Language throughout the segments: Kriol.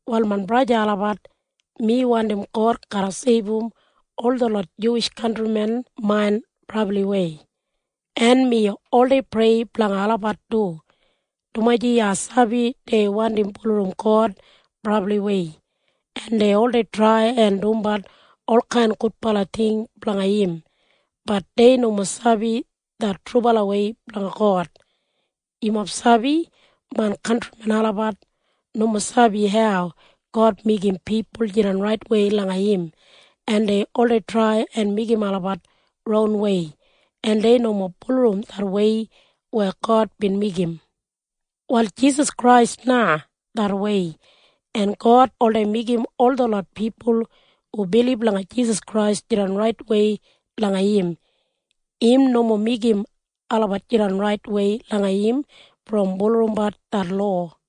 Wal main braja en sista olabat, mi wandim God garra seibum ol detlot Juwish kantrimen main brabliwei. En mi oldei prei blanga olabat du, dumaji ai sabi dei wandim bulurrum God brabliwei, en dei oldei trai en dumbat olkain gudbala ting blanga im. Bat dei nomo sabi det trubalawei blanga God. Yumob sabi? Main kantrimen olabat nomo sabi hau God meigim pipul jidan raitwei langa im, en dei oldei trai en meigim olabat ronwei, en dei nomo bulurrum det wei weya God bin meigim. Wal Jisas Krais na det wei. En God oldei meigim ol detlot pipul hu bilib langa Jisas Krais jidan raitwei langa im. Im nomo meigim olabat jidan raitwei langa im brom bulurrumbat det lowa.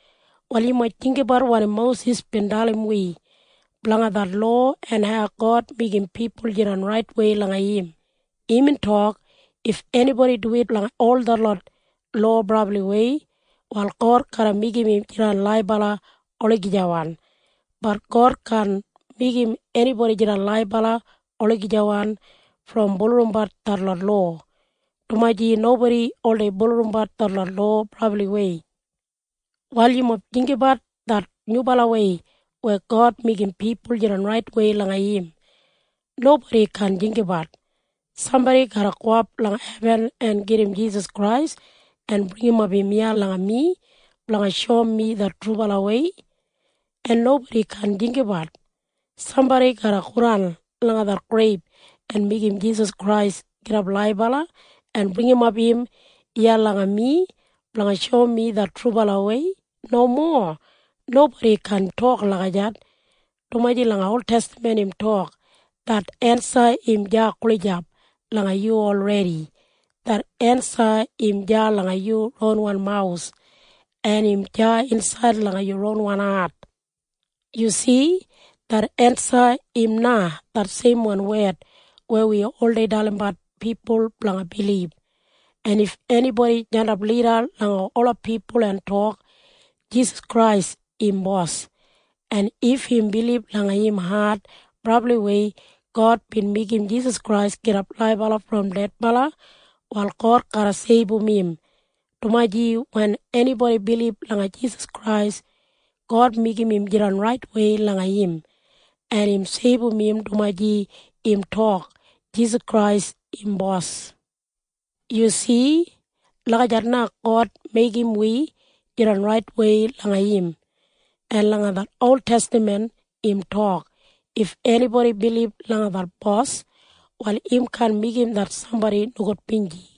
Wal yumob jinggabat wanim Mosis bin dalim wi blanga det lowa en hau God meigim pipul jidan raitwei langa im. Imbin tok, “If enibodi duwit langa ol detlot lowa brabliwei, wal God garra meigim im jidan laibala olagijawan.” Bat God kaan meigim enibodi jidan laibala olagijawan brom bulurrumbat detlot lowa, dumaji nobodi oldei bulurrumbat detlot lowa brabliwei. Wal yumob jinggabat det nyubalawei weya God meigim pipul jidan raitwei langa im. Nobodi kaan jinggabat, “Sambodi garra gowap langa hebin en gedim Jisas Krais en bringimap im iya langa mi blanga shoum mi det trubalawei.” En nobodi kaan jinggabat, “Sambodi garra godan langa det greib en meigim Jisas Krais gidap laibala en bringimap im iya langa mi blanga shoum mi det trubalawei.” Nomo. Nobodi kaan tok lagijat, dumaji langa oltestaman im tok det ensa im deya gulijap langa yu olredi. Det ensa im deya langa yu ronwan mawus, en im deya insaid langa yu ronwan hat. Yu si? Det ensa im na det seimwan wed weya wi oldei dalimbat pipul blanga bilib. En if enibodi jandap lida langa ola pipul en tok, “Jisas Krais im Bos,” en if im bilib langa im hat brabliwei God bin meigim Jisas Krais gidap laibala brom dedbala, wal God garra seibum im, dumaji wen enibodi bilib langa Jisas Krais, God meigim im jidan raitwei langa im, en im seibum im dumaji im tok, “Jisas Krais im Bos.” Yu si? Lagijat na God meigim wi jidan raitwei langa im. En langa det oltestaman im tok, “If enibodi bilib langa det Bos, wal im kaan meigim det sambodi nogudbinji.”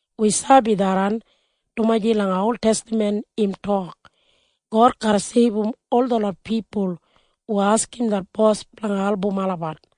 Wi sabi tharran, dumaji langa oltestaman im tok, “God garra seibum ol detlot pipul hu askim det Bos blanga album olabat.”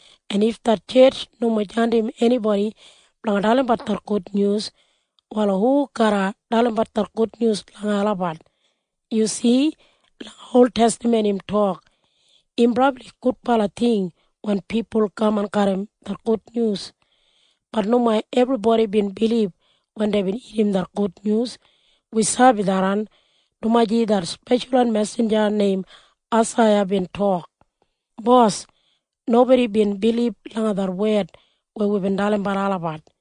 En if det tjetj nomo jandim enibodi blanga dalimbat det gudnyus, wal hu garra dalimbat det gudnyus langa olabat? Yu si? Langa oltestaman im tok, “Im brabli gudbala ting wen pipul kaman garram det gudnyus.” Bat nomo ebribodi bin bilib wen deibin irrim det gudnyus. Wi sabi tharran, dumaji det speshalwan mesinja neim Aisaiya bin tok, “Bos, nobodi bin bilib langa det wed weya wibin dalimbat olabat.”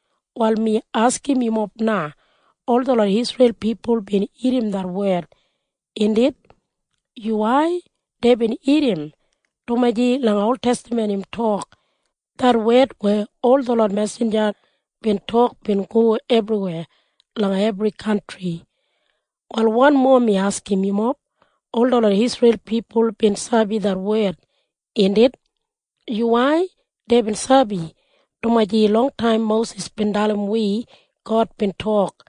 Wal mi askim yumob na. Ol detlot Isreil pipul bin irrim det wed, indit? Yuwai. Deibin irrim, dumaji langa oltestaman im tok, “Det wed weya ol detlot mesinja bin tok bin go ebriweya langa ebri kantri.” Wal wanmo mi askim yumob. Ol detlot Isreil pipul bin sabi det wed, indit? Yuwai. Deibin sabi, dumaji longtaim Mosis bin dalim wi God bin tok,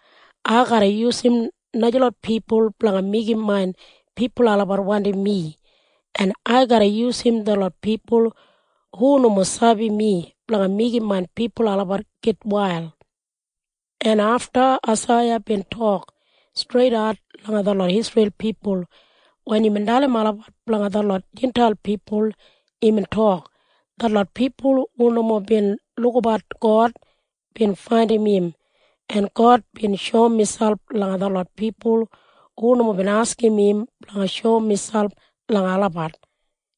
“Ai garra yusum najalot pipul blanga meigim main pipul olabat wandim mi, en ai garra yusum detlot pipul hu nomo sabi mi blanga meigim main pipul olabat gitwail.” En afta Aisaiya bin tok streidat langa detlot Isreil pipul wen imbin dalim olabat blanga detlot Jintail pipul. Imbin tok, “Detlot pipul hu nomo bin lukabat God bin faindim im, en God bin shoum miselp langa detlot pipul hu nomo bin askim im blanga shoum miselp langa olabat.”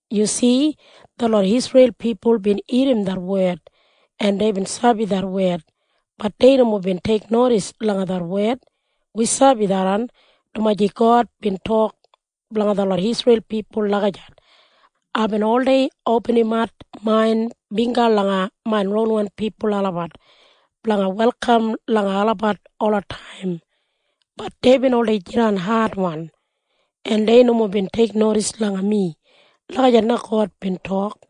Yu si? Detlot Isreil pipul bin irrim det wed, en deibin sabi det wed. Bat dei nomo bin teiknodis langa det wed. Wi sabi tharran, dumaji God bin tok blanga detlot Isreil pipul lagijat, “Aibin oldei opinimat main bingga langa main ronwan pipul olabat blanga welkam langa olabat olataim. Bat deibin oldei jidan adwan, en dei nomo bin teiknodis langa mi.” Lagijat na God bin tok.